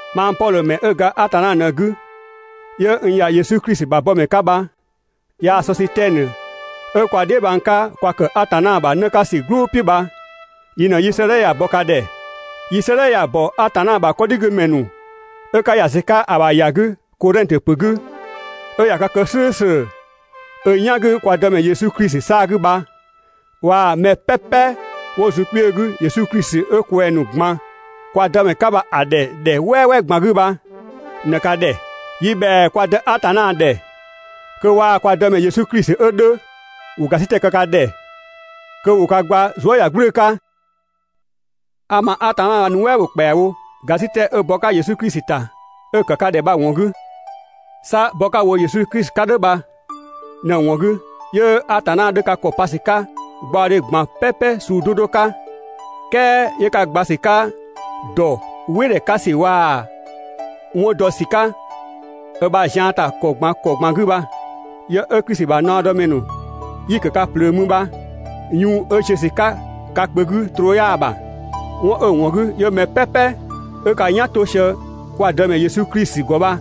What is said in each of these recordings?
Mang Pɔdhö ‑mɛ 'ö ga Atanna ꞊në‑ 'gü 'yö n ‑ya Yesu Klisi ‑bha bɔmɛ 'ka bha, yaa‑ Sɔsitɛnö 'ö kwa dheebhang 'ka kwa ‑kë Atanna ‑bha 'në 'ka ‑sü "gblʋʋ "piʋ̈ bha, yi ꞊në 'yi 'sëëdhɛ ya‑ bɔ ka ‑dhɛ. Yi 'sëëdhɛ ya‑ ‑bɔ Atanna ‑bha 'kɔdhigümɛ ‑nu 'ö 'ka ‑ya ‑sü 'ka‑ ‑bha ‑ya 'gü Kodhɛngtö ‑pö 'gü, 'ö ꞊ya ka kë "slʋ̈ʋ̈slʋ̈ ö "yan 'gü kwa Dëmɛ Yesu Klisi 'saa‑ 'gü bha, waa‑ mɛ "pɛpɛ 'wo zun wo kpiö 'gü Yesu Klisi 'ö kwɛng‑ ‑nu ꞊gban kwa Dëmɛ 'ka bha‑ ‑dhɛ ‑dhɛ "wɛɛ "pɛpɛ ꞊gban 'gü bha ꞊në ka ‑dhɛ. Yi ‑bhɛa kwa dë Atanna ‑dhɛ kö waa‑ kwa Dëmɛ Yesu Klisi 'ö 'dhö, ‑wo ‑gasitɛ kë ka ‑dhɛ, kö ‑wo ka gba zuëyagblʋ̈ʋ̈‑ 'ka. A ma Atanna bha‑ nuɛ" ‑bho ‑kpɛawo ‑gasitɛ 'ö bɔ‑ 'ka Yesu Klisi ‑ta 'ö‑ ‑kë ka ‑dhɛ bha‑ ‑wɔn 'gü. 'Sa bɔ 'ka‑ wo Yesu Klisi 'ka "dhʋ̈ bha ꞊në‑ ‑wɔn 'gü 'yö Atanna 'dhö ka ‑kɔ pa ‑sü 'ka gbaɔdhe ꞊gban "pɛpɛ suu 'do 'do 'ka, "kɛɛ 'yö ka gba ‑sü 'ka ‑dɔ "wɩ ‑dhɛ 'ka ‑sü waa‑ 'wɔn dɔ ‑sü 'ka ö ‑bha zian ‑ta ‑kɔ ꞊gban ‑kɔ ꞊gban 'gü bha. Yë 'ö Klisi ‑bha naɔdɔmɛ ‑nu 'yi‑ ‑kë ka ꞊plöö mü bha, yun 'ö‑ ziö ‑sü 'ka ka kpö 'gü troo 'yaa‑ ‑bha. 'Wɔn 'ö‑ ‑wɔn 'gü 'yö mɛ "pɛpɛ 'ö 'ka "yan 'to sië kwa Dëmɛ Yesu Klisi ‑gɔ bha,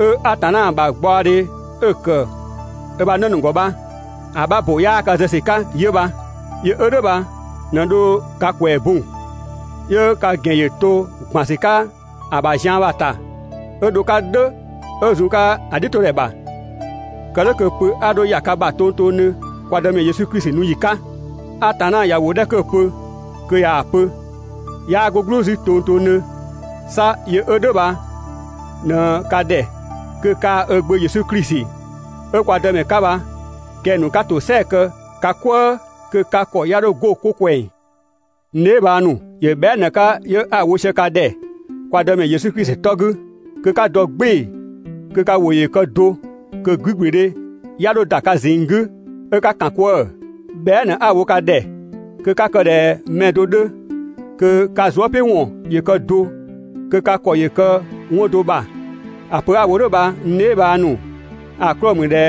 'ö Atanna ‑bha gbaɔdhe 'ö‑ ‑kë ö ‑bha 'në ‑nu ‑gɔ bha‑ 'bha ‑bo 'yaa ka zë ‑sü 'ka bha 'yö bha. Yö 'ö "dhʋ̈ bha ꞊në dho ka ‑kwɛɛ bun, 'yö ka ‑gɛn ‑yö to ‑gban ‑sü 'ka‑ ‑bha zian bha‑ ‑ta 'ö dho‑ 'ka "dhʋ̈ 'ö zun‑ 'ka‑ "dhiʋ̈todhɛ ‑bha, kë "dhʋ̈ kö pö 'a 'dho ‑ya ka ‑bha tongtongdhö kwa Dëmɛ Yesu Klisi nu ‑yi 'ka. Atanna ꞊ya ‑wʋ 'dhɛ 'kö‑ pö kö ꞊yaa‑ pö, 'yaa 'go "gblʋʋ 'zü tongtongdhö. 'Sa yö 'ö "dhʋ̈ bha ꞊në ka ‑dhɛ kö kaa‑ ö Gbö Yesu Klisi 'ö kwa Dëmɛ 'ka bha kɛng‑ ‑nu 'ka ‑tosɛa kë ka "kwëë, kö ka ‑kɔ 'ya 'dho 'go 'ko ꞊kwɛng. N dheebhang ‑nu, ‑yö bhɛa" ꞊në‑ 'ka 'yö 'a‑ wo sië ka ‑dhɛ kwa Dëmɛ Yesu Klisi 'tɔ 'gü, kö 'ka dɔ "gbɩɩ‑ kö ka ‑wʋ ‑yö kë do, kö 'gügblüdhe 'ya 'dho ‑da ka ꞊zinng 'gü 'ö 'ka ‑kan 'kwëë‑. Bhɛa" ꞊në 'a‑ wo ka ‑dhɛ kö 'ka kë ꞊dhɛ mɛ do 'dhö, kö ka zuëpiʋ̈wɔn ‑yö kë do, kö ka ‑kɔ ‑yö kë 'wɔn do ‑bha. ‑A pö 'a‑ wo "dhʋ̈ bha n dheebhang ‑nu, ‑a 'klɔɔ‑ ‑mü ꞊dhɛ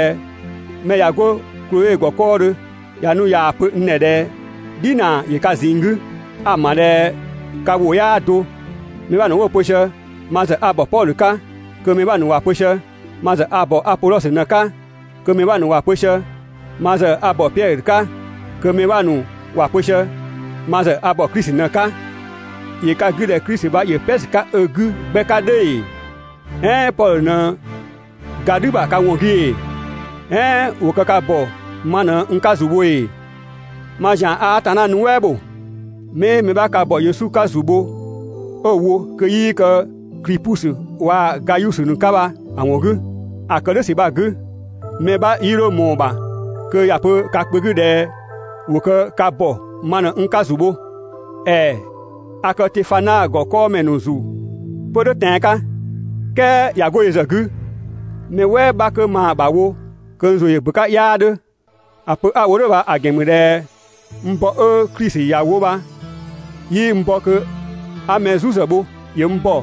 mɛ ꞊ya 'go Kloe ‑gɔ 'kɔɔdhö ꞊ya nu ꞊yaa‑ pö n ‑dhɛ ꞊dhɛ "dhinaa ‑yö ka ꞊zinng 'gü. A‑ ‑ma ꞊dhɛ ka ‑wʋ 'yaa do. Mɛ 'bha ‑nu 'wo‑ pö sië: «Ma ‑zë a ‑bɔ Pɔdhö 'ka», kö mɛ 'bha ‑nu ‑wa pö sië: «Ma ‑zë a ‑bɔ Apodhɔsö ꞊në‑ 'ka», kö mɛ 'bha ‑nu ‑wa pö sië: «Ma ‑zë a ‑bɔ Piɛdhö 'ka,» kö mɛ 'bha ‑nu ‑wa pö sië: «Ma ‑zë a ‑bɔ Klisi ꞊në‑ 'ka». ‑Yö ka 'gü ꞊dhɛ Klisi bha ‑yö "pɛ ‑sü 'ka ö 'gü 'gbɛ 'ka "dhʋ̈ ‑ee? "Ɛɛn Pɔdhö ꞊në ga "dhü ‑bha ka ‑wɔn 'gü ‑ee? "Ɛɛn ‑wo kë ka ‑bɔ ma ꞊në n 'ka ‑zu bho ‑ee? Mang ‑zian a Atanna nuɛ" ‑bho 'mii mɛ 'bha ka ‑bɔ Yesu 'ka ‑zu bho 'ö‑ wo kö 'yii kë Klipusö waa‑ Gayusö ‑nu 'ka bha‑ ‑wɔn 'gü. ‑A ‑kë "dhʋ̈ ‑sü bha‑ 'gü, mɛ 'bha 'yii 'dho ꞊mɔɔ‑ ‑bha kö ‑ya pö ka kpö 'gü ꞊dhɛ ‑wo kë ka ‑bɔ ma ꞊në n 'ka ‑zu bho. ‑Ɛɛ a kë Tefana ‑gɔ 'kɔɔmɛ ‑nu ‑zu 'pö "dhʋ̈ tɛan‑ 'ka, "kɛɛ ꞊ya 'go yö ‑zë 'gü, mɛ "wɛɛ 'bha 'kö maa‑ ‑bha wo kö n ‑zʋ ‑yö ‑bö 'ka 'yaa 'dhö. ‑A pö 'a‑ wo "dhʋ̈ bha‑ ‑gɛn ‑mü ꞊dhɛ n bɔ 'ö Klisi ‑ya wo bha 'yii n bɔ kö 'a mɛ "zu ‑zë bho. ‑Yö n ‑bɔ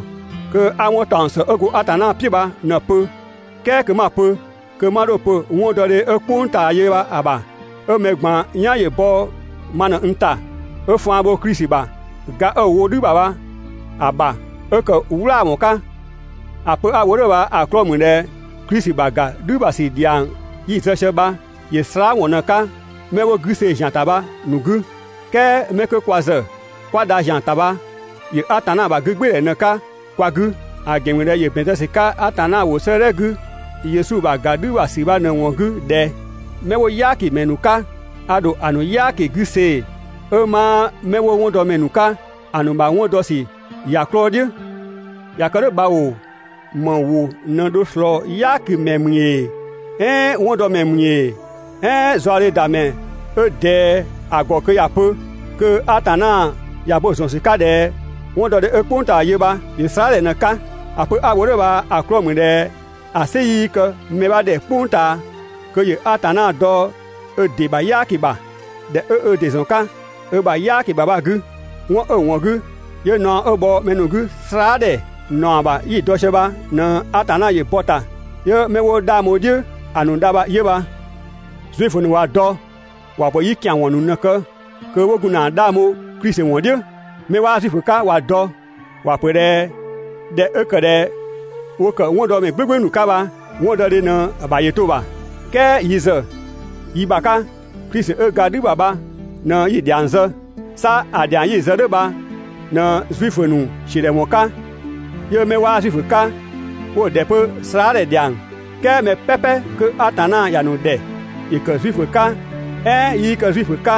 kö 'a 'wɔn ‑taɔng ‑së 'ö go Atanna "piʋ̈ bha ꞊në‑ pö, "kɛɛ kö 'ma‑ pö, kö 'ma 'dho‑ pö 'wɔndɔdhe 'ö "kpʋng ꞊taa yö bha‑ ‑bha, ('ö mɛ ꞊gban "yan ‑yö bɔ ma ꞊në n ‑ta) 'ö faan bho Klisi ‑bha ga 'ö‑ wo "dhü ‑bha bha‑ ‑bha 'ö ‑kë "wlaawɔn 'ka. ‑A pö 'a‑ wo "dhʋ̈ bha‑ 'klɔɔ‑ ‑mü ꞊dhɛ Klisi ‑bha ‑ga "dhü ‑bha ‑sü ‑dhiang 'yi‑ zë sië bha, ‑yö slaadhɛ ‑wɔn ꞊në‑ 'ka 'mɛ wo 'gü see‑ ‑zian ‑ta bha‑ ‑nu 'gü. "Kɛɛ 'mɛ 'kö kwa ‑zë 'kwa dha ‑zian ‑ta bha ‑yö Atanna ‑bha 'gügbɩɩdhɛ ꞊në‑ 'ka kwa 'gü. ‑A pö 'a‑ wo "dhʋ̈ bha‑ 'klɔɔ‑ ‑mü ꞊dhɛ ‑yö ‑bɛn zë ‑sü 'ka Atanna ‑wʋ 'sëëdhɛ 'gü (Yesu ‑bha ‑ga "dhü ‑bha ‑sü bha ꞊në‑ ‑wɔn 'gü) ꞊dhɛ: «'Mɛ 'wo "yaakimɛ ‑nu 'ka a ‑dho ‑a ‑nu "yaaki 'gü see‑ 'ö 'maa 'mɛ 'wo 'wɔndɔmɛ ‑nu 'ka ‑a ‑nu ‑bha 'wɔn dɔ ‑sü ‑ya 'klɔɔ‑ "dhiʋ̈.» ꞊Ya kë "dhʋ̈ bha ‑oo, ‑më ‑wʋ ꞊në dho ꞊slɔɔ "yaakimɛ ‑mü ‑ee, "ɛɛn 'wɔndɔmɛ ‑mü ‑ee, "ɛɛn zaɔdhedamɛ 'ö ꞊dɛɛ ‑a ‑gɔ kö ‑ya pö, kö Atanna ꞊ya bo‑ ‑zɔn ‑sü 'ka ꞊dhɛ 'wɔndɔdhe 'ö "kpʋng ꞊taa yö bha ‑yö slaadhɛ ꞊në‑ 'ka? ‑A pö 'a‑ wo "dhʋ̈ bha‑ 'klɔɔ‑ ‑mü ꞊dhɛ ‑a "sɩ 'yii kë mɛ 'bha ‑dhɛ "kpʋng ꞊taa kö ‑yö Atanna dɔ ö ‑dɩ ‑bha "yaaki ‑bha, ‑dhɛ 'ö ö ‑dɩ ‑zɔn 'ka ö ‑bha "yaaki ‑bha bha‑ 'gü. 'Wɔn 'ö‑ ‑wɔn 'gü 'yö naɔ 'ö bhɔ mɛ ‑nu 'gü slaadhɛ ‑naɔ ‑bha 'yi‑ dɔ sië bha ꞊në Atanna ‑yö bɔ‑ ‑ta 'yö 'mɛ 'wo 'dhang bho‑ "dhiʋ̈ ‑a ‑nu dha bha 'yö bha. Zuifö ‑nu ꞊wa dɔ ‑wa ‑pö 'yi ‑kian ‑wɔn ‑nu ꞊në‑ kë kö 'wo gun ‑na 'dhang bho Klisi ‑wɔn "dhiʋ̈. 'Mɛ 'waa Zuifö 'ka ꞊wa dɔ ‑wa ‑pö ꞊dhɛ ꞊dhɛ 'ö ‑kë ꞊dhɛ ‑wo ‑kë 'wɔndɔmɛ "gblʋ̈gblʋ̈ ‑nu 'ka bha, 'wɔndɔdhe ꞊në‑ ‑bha ‑yö to‑ ‑bha. "Kɛɛ yi ‑zë yi ‑bha 'ka, Klisi 'ö ga "dhü ‑bha bha ꞊në 'yi‑ dhiang zë. 'Sa ‑a ‑dhiang 'yi‑ zë "dhʋ̈ bha ꞊në Zuifö ‑nu ‑siödhɛwɔn 'ka, 'yö 'mɛ 'waa Zuifö 'ka 'wo‑ ‑dhɛ 'pö slaadhɛ ‑dhiang. "Kɛɛ mɛ "pɛpɛ 'kö Atanna ‑ya ‑nu ‑dhɛ, ‑yö ‑kë Zuifö 'ka "ɛɛn 'yii kë Zuifö 'ka,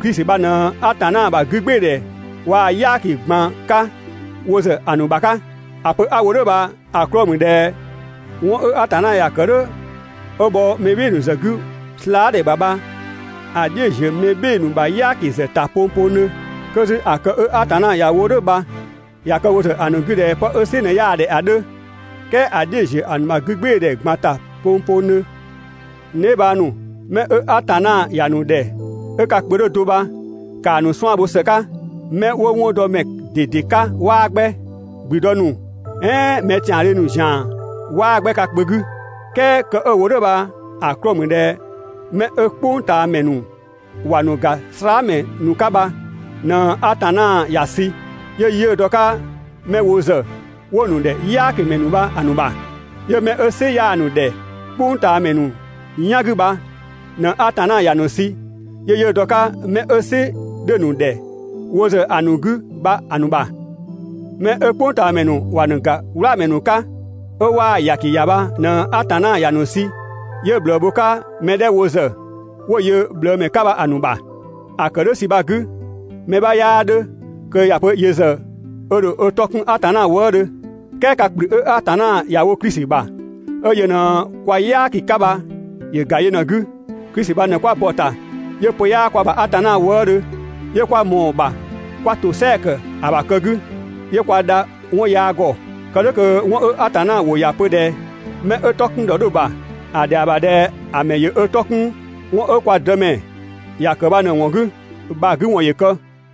Klisi bha ꞊në Atanna ‑bha 'gügbɩɩdhɛ waa‑ "yaaki ꞊gban 'ka wo ‑zë ‑a ‑nu ‑bha 'ka. ‑A pö 'a‑ wo "dhʋ̈ bha‑ 'klɔɔ‑ ‑mü ꞊dhɛ 'wɔn 'ö Atanna ‑ya kë "dhʋ̈ 'ö bhɔ mɛ "bhɩɩ‑ ‑nu ‑zë 'gü slaa" ‑bha bha‑ "dhiʋ̈‑ ‑ziö mɛ "bhɩɩ‑ ‑nu ‑bha "yaaki ‑zë ‑ta pongpongdhö. 'Kö 'zü ‑a kë 'ö Atanna ‑ya wo "dhʋ̈ bha ꞊ya kë wo ‑zë ‑a ‑nu 'gü ꞊dhɛ 'pë 'ö "sɩ ꞊në 'yaa‑ ‑dhɛ ‑a 'dhö, "kɛɛ ‑a "dhiʋ̈‑ ‑ziö ‑a ‑nu ‑bha 'gügbɩɩdhɛ ꞊gban ‑ta pongpongdhö. N dheebhang ‑nu, mɛ 'ö Atanna ‑ya ‑nu ‑dhɛ 'ö ka kpö 'dhö do bha ‑kaa ‑nu 'suan‑ bho ‑së 'ka. 'Mɛ 'wo 'wɔndɔmɛ ꞊dede 'ka 'waa 'gbɛ, ‑gblüdë ‑nu "ɛɛn mɛ ‑tiandhö ‑nu ‑zian 'waa 'gbɛ ka kpö 'gü. "Kɛɛ kë 'ö‑ wo "dhʋ̈ bha‑ 'klɔɔ‑ ‑mü ꞊dhɛ 'mɛ 'ö "kpʋngtaamɛ ‑nu ‑wa ‑nu ‑ga slaamɛ ‑nu 'ka bha, ꞊në Atanna ‑ya sü 'yö 'yiʋ̈‑ dɔ‑ 'ka 'mɛ wo ‑zë 'wo‑ ‑nu ‑dhɛ "yaakimɛ ‑nu bha‑ ‑nu ‑bha. 'Yö 'mɛ 'ö "sɩ 'yaa‑ ‑nu ‑dhɛ "kpʋngtaamɛ ‑nu "yan 'gü bha ꞊në Atanna ‑ya ‑nu sü 'yö 'yiʋ̈‑ dɔ‑ 'ka 'mɛ 'ö "sɩ 'dhö‑ ‑nu ‑dhɛ wo ‑zë ‑a ‑nu 'gü bha‑ ‑nu ‑bha. Mɛ 'ö "kpʋngtaamɛ ‑nu ‑wa ‑nu ‑ga "wlaamɛ ‑nu 'ka 'ö 'waa‑ ‑yaki ‑ya bha ꞊në Atanna ‑ya ‑nu sü 'yö ꞊bhlëë bho‑ 'ka mɛ 'dhɛ wo ‑zë 'wo‑ yö ꞊bhlëëmɛ 'ka bha‑ ‑nu bha. ‑A ‑kë "dhʋ̈ ‑sü bha‑ 'gü, mɛ 'bha 'yaa 'dhö kö ‑ya pö yö ‑zë ö ‑dho ö 'tɔ 'kun Atanna wëëdhö. "Kɛɛ ka ‑kplü 'ö Atanna ‑ya wo Klisi ‑bha, 'ö yö ꞊në kwa "yaaki 'ka bha ‑yö ‑ga yö ꞊në‑ 'gü. Klisi bha ꞊në 'kwa bɔ‑ ‑ta 'yö pö 'yaa kwa ‑bha Atanna wëëdhö, 'yö 'kwa ꞊mɔɔ‑ ‑bha 'kwa ‑tosɛa ‑kë ‑a ‑bha kë 'gü, 'yö kwa dha 'wɔn yaa ‑gɔ. Kë "dhʋ̈ kö 'wɔn 'ö Atanna ‑wʋ ‑ya pö ꞊dhɛ: «Mɛ 'ö 'tɔ 'kun ‑dhɔ 'dhö‑ ‑bha ‑a ‑dhɛa ‑bha ꞊dhɛ ‑a ‑mɛ ‑yö ö 'tɔ 'kun 'wɔn 'ö kwa Dëmɛ ‑ya ‑kë bha ꞊në‑ ‑wɔn 'gü» bha‑ 'gü ‑wɔn ‑yö kë.